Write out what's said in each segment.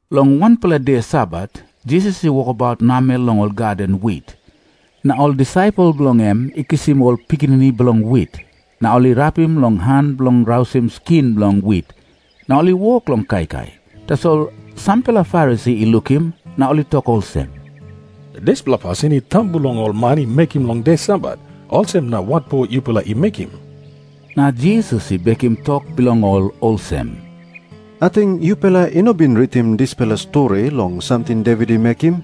Long wanpela de Sabat, Jisas i wokabaut namel long ol gaden wit. Na ol disaipel bilong en i kisim ol pikinini bilong wit, na ol i rapim long han bilong rausim skin bilong wit, na ol i wok long kaikai. Tasol sampela Farisi i lukim na ol i tok olsem, "Dispela pasin I tambu long ol man i mekim long de Sabat, olsem na watpo yupela I mekim?" Na Jisas i bekim tok bilong ol olsem, "Ating yupela i no bin ritim dispela stori long samting Devit i mekim?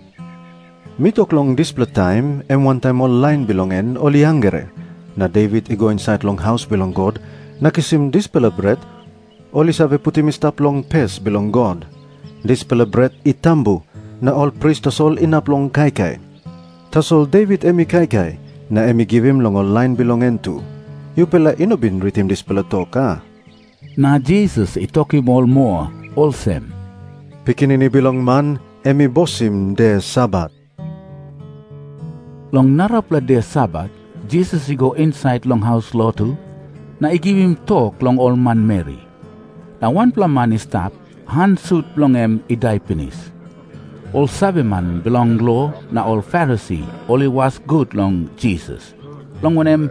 Mi tok long dispela taim em wantaim ol lain bilong en ol i hangre na Devit i go insait long haus bilong God na kisim dispela bret ol i save putim i stap long pes bilong God. Dispela bret i tambu, na ol pris tasol inap long kaikai. Tasol Devit em i kaikai, na em i givim long ol lain bilong en tu. Yupela i no bin ritim dispela tok, a?" Na Jisas i tokim ol moa olsem, "Pikinini Bilong Man em i bosim de Sabat." Long narapela de Sabat Jisas i go insait long haus lotu na i givim tok long ol manmeri. Na wanpela man i stap, han sut bilong en i dai pinis. Ol saveman bilong lo na ol Farisi ol i was gut long Jisas, long wanem,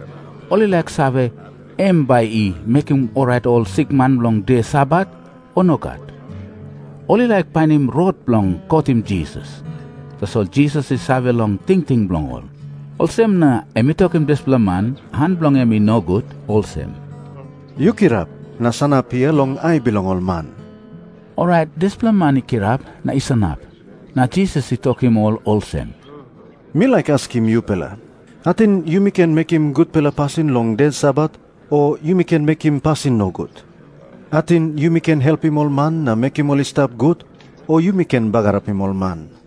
ol i laik save, em bai i mekim orait ol sikman long de Sabat, o nogat. Ol i laik painim rot bilong kotim Jisas. Tasol Jisas i save long tingting bilong ol. Olsem na em i tokim dispela man, han bilong en i nogut, olsem, "Yu kirap na sanap hia long ai bilong ol man." Orait dispela man i kirap na i sanap. Na Jisas i tokim ol olsem, "Mi laik askim yupela. Ating yumi ken mekim gutpela pasin long de Sabat, o yumi ken mekim pasin nogut? Ating yumi ken helpim ol man na mekim ol i stap gut, o yumi ken bagarapim ol man?"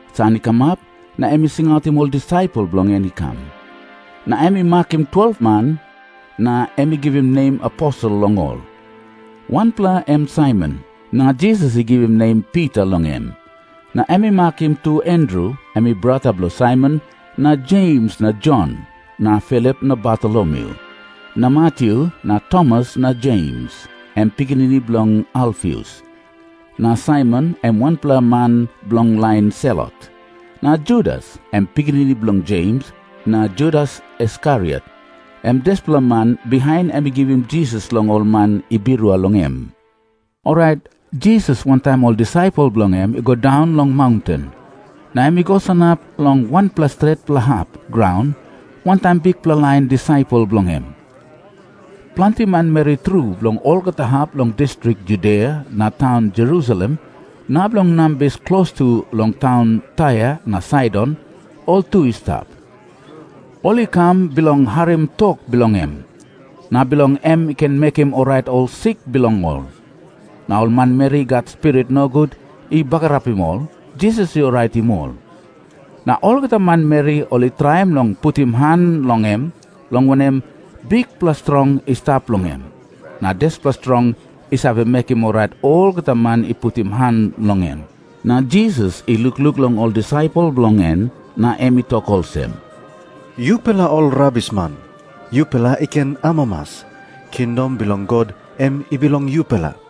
San i kamap, na em i singautim ol disaipel bilong en i kam. Na em i makim 12-pela, na em i givim nem aposel long ol. Wanpela em Saimon, na Jisas i givim nem Pita long em. Na em i makim tu Andru, em i brata bilong Saimon, na Jems na Jon na Filip na Bartolomyu na Matyu na Tomas na Jems, em pikinini bilong Alfius, na Saimon, em wanpela man bilong lain Selot, na Judas, em pikinini bilong Jems, na Judas Iskariot, em dispela man bihain em i givim Jisas long ol man i birua long em. Orait Jisas wantaim ol disaipel bilong en i go daun long maunten, na em i go sanap long wanpela stretpela hap graun wantaim bikpela lain disaipel bilong en. Planti manmeri tru bilong olgeta hap bilong distrik Judia na taun Jerusalem na bilong nambis klostu long taun Tair na Saidon, ol tu i stap. Ol i kam bilong harim tok bilong em, na bilong em i ken mekim orait ol sik bilong ol. Na ol manmeri i gat spirit nogut i bagarapim ol, Jisas i oraitim ol. Na olgeta manmeri ol i traim long putim han long em, long wanem, bikpela strong i stap long em, na dispela strong i save mekim orait olgeta man i putim han long em. Na Jisas i lukluk long ol disaipel bilong en, na em i tok olsem, "Yupela ol rabisman, yupela i ken amamas. Kingdom bilong God em bilong yupela.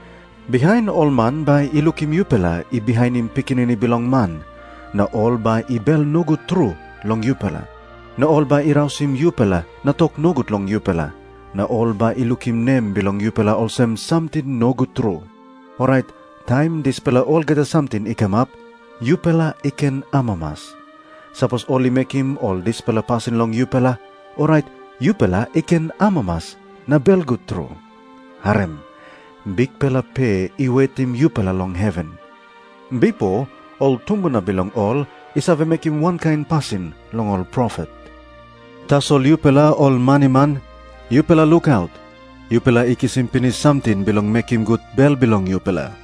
"Bihain ol man bai i lukim yupela i bihainim Pikinini Bilong Man, na ol bai i bel nogut tru long yupela, na ol bai i rausim yupela na tok nogut long yupela, na ol bai i lukim nem bilong yupela olsem samting nogut tru. Orait taim dispela olgeta samting i kamap, yupela i ken amamas. Sapos ol i mekim ol dispela pasin long yupela, orait yupela i ken amamas na belgut tru. Harim. Bikpela pe i wetim yupela long heven. Bipo ol tumbuna bilong ol i save mekim wankain pasin long ol profet. "Tasol yupela ol maniman, yupela lukaut. Yupela i kisim pinis samting bilong mekim gut bel bilong yupela.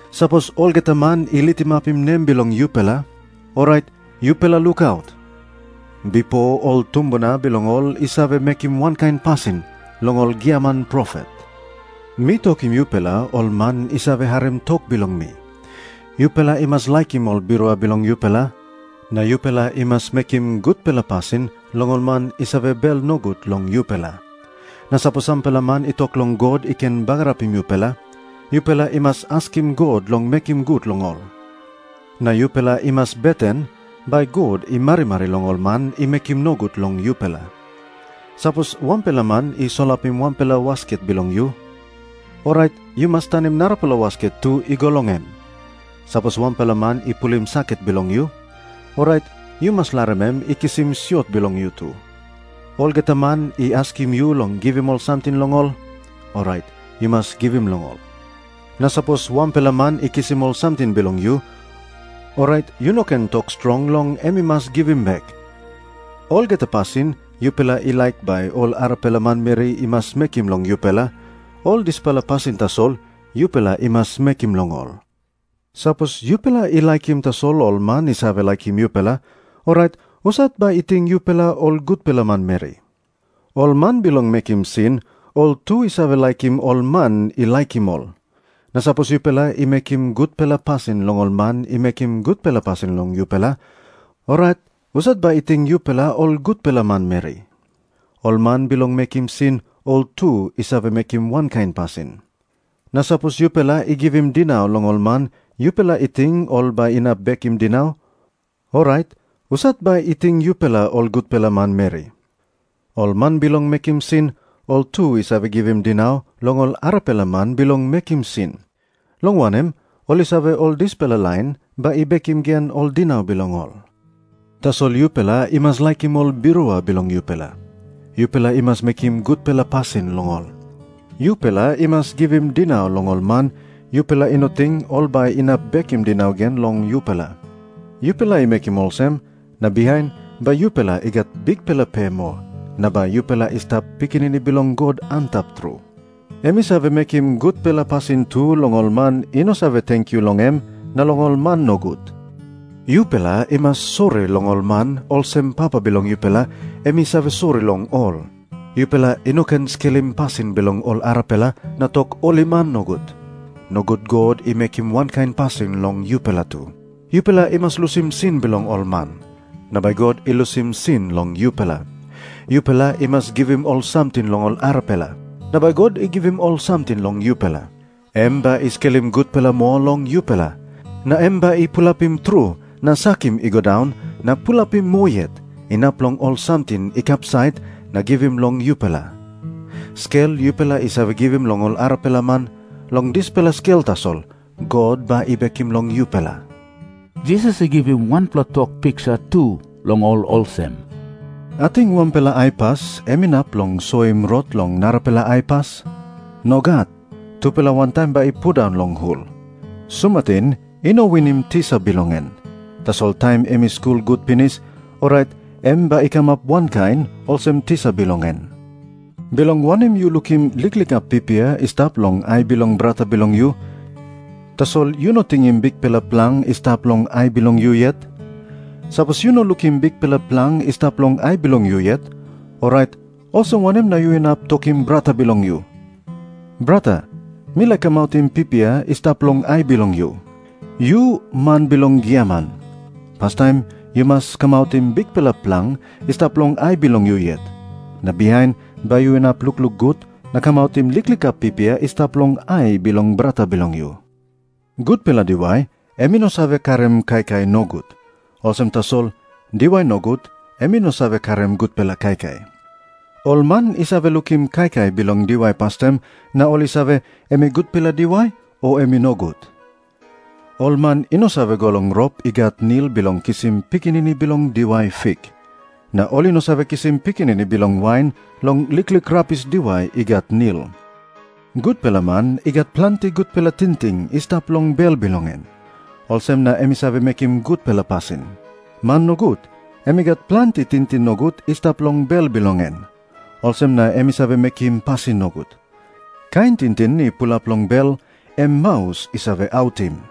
Sapos olgeta man i litimapim nem bilong yupela, orait yupela lukaut. Bipo ol tumbuna bilong ol i save mekim wankain pasin long ol giaman profet." Jisas i tok moa olsem, "Mi tokim yupela ol man i save harim tok bilong mi, yupela i mas laikim ol birua bilong yupela, na yupela i mas mekim gutpela pasin long ol man i save bel nogut long yupela. Na sapos sampela man i tok long God i ken bagarapim yupela, yupela i mas askim God long mekim gut long ol. Na yupela i mas beten bai God i marimari long ol man i mekim nogut long yupela. Sapos wanpela man i solapim wanpela wasket bilong yu, orait yu mas tanim narapela wasket tu i go long em. Sapos wanpela man i pulim saket bilong yu, orait yu mas larim em i kisim siot bilong yu tu. Olgeta man i askim yu long givim ol samting long ol, orait yu mas givim long ol. Na sapos wanpela man i kisim ol samting bilong yu, orait yu no ken tok strong long em i mas givim bek. Olgeta pasin yupela i laik bai ol arapela manmeri i mas mekim long yupela, ol dispela pasin tasol yupela i mas mekim long ol. "Sapos yupela i laikim tasol ol man i save laikim yupela, orait husat bai i ting yupela ol gutpela manmeri? Ol man bilong mekim sin ol tu i save laikim ol man i laikim ol. Na sapos yupela i mekim gutpela pasin long ol man i mekim gutpela pasin long yupela, orait husat bai i ting yupela ol gutpela manmeri? Ol man bilong mekim sin ol tu i save mekim wankain pasin. Na sapos yupela i givim dinau long ol man yupela i ting ol bai inap bekim dinau, orait husat bai i ting yupela ol gutpela manmeri? Ol man bilong mekim sin ol tu i save givim dinau long ol arapela man bilong mekim sin, long wanem, ol i save ol dispela lain bai i bekim gen ol dinau bilong ol. Tasol yupela i mas laikim ol birua bilong yupela. Yupela i mas mekim gutpela pasin long ol. Yupela i mas givim dinau long ol man, yupela i no ting ol bai inap bekim dinau gen long yupela. Yupela i mekim olsem, na bihain bai yupela i gat bikpela pe moa, na bai yupela i stap pikinini bilong God Antap Tru. Em i save mekim gutpela pasin tu long ol man i no save tenkyu long em na long ol man nogut. Yupela i mas sori long ol man, olsem Papa bilong yupela em i save sori long ol." Jisas i tok moa olsem, "Yupela i no ken skelim pasin bilong ol arapela na tok ol i man nogut. Nogut God i mekim wankain pasin long yupela tu. Yupela i mas lusim sin bilong ol man, na bai God i lusim sin long yupela. Yupela i mas givim ol samting long ol arapela, na bai God i givim ol samting long yupela. Em bai i skelim gutpela moa long yupela, na em bai i pulapim tru, na sakim i go daun, na pulapim moa yet, inap long ol samting i kapsait, na givim long yupela. Skel yupela i save givim long ol arapela man, long dispela skel tasol God bai i bekim long yupela." Jisas i givim wanpela tok piksa tu long ol olsem, "Ating wanpela aipas em inap long soim rot long narapela aipas? Nogat. Tupela wantaim bai i pundaun long hul. Sumatin i no winim tisa bilong en. Tasol taim em i skul gut pinis, orait em bai i kamap wankain olsem tisa bilong en. "Bilong wanem yu lukim liklik hap pipia i stap long ai bilong brata bilong yu, tasol yu no tingim bikpela plang i stap long ai bilong yu yet? Sapos yu no lukim bikpela plang i stap long ai bilong yu yet, orait olsem wanem na yu inap tokim brata bilong yu, 'Brata, mi laik kamautim pipia i stap long ai bilong yu'? Yu man bilong giaman, pastaim yu mas kamautim bikpela plang i stap long ai bilong yu yet. Na bihain bai yu inap lukluk gut na kamautim liklik hap pipia i stap long ai bilong brata bilong yu." Jisas i tok moa olsem, "Gutpela diwai em i no save karim kaikai nogut. Olsem tasol diwai nogut em i no save karim gutpela kaikai. Ol man i save lukim kaikai bilong diwai pastaim na ol i save, em i gutpela diwai, o em i nogut. Ol man i no save go long rop i gat nil bilong kisim pikinini bilong diwai fik. Na ol i no save kisim pikinini bilong wain long liklik rabis diwai i gat nil. Gutpela man i gat planti gutpela tingting i stap long bel bilong en. Olsem na em i save mekim gutpela pasin. Man nogut em i gat planti tingting nogut i stap long bel bilong en. Olsem na em i save mekim pasin nogut. Kain tingting i pulap long bel, em maus i save autim."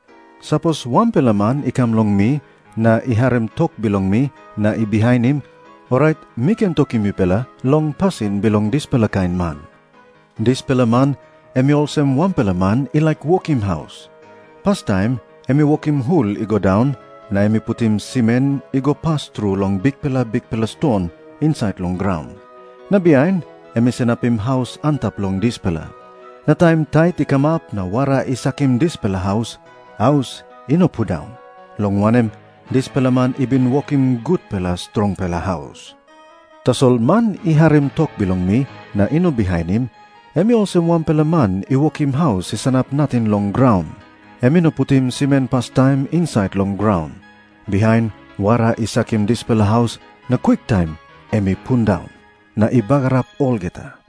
Sapos wanpela man i kam long mi, na i harim tok bilong mi na i bihainim, orait mi ken tokim yupela long pasin bilong dispela kain man. Dispela man em i olsem wanpela man i laik wokim haus. Pastaim em i wokim hul i go daun, na em i putim simen i go pas tru long bikpela bikpela ston insait long graun. Na bihain em i sanapim haus antap long dispela. Na taim tait i kamap na wara i sakim dispela haus, haus i no pundaun, long wanem, dispela man i bin wokim gutpela strongpela haus. Tasol man i harim tok bilong mi na i no bihainim, em i olsem wanpela man i wokim haus i sanap nating long graun. Em i no putim simen pastaim insait long graun. Bihain wara i sakim dispela haus, na kwiktaim em i pundaun, na i bagarap olgeta."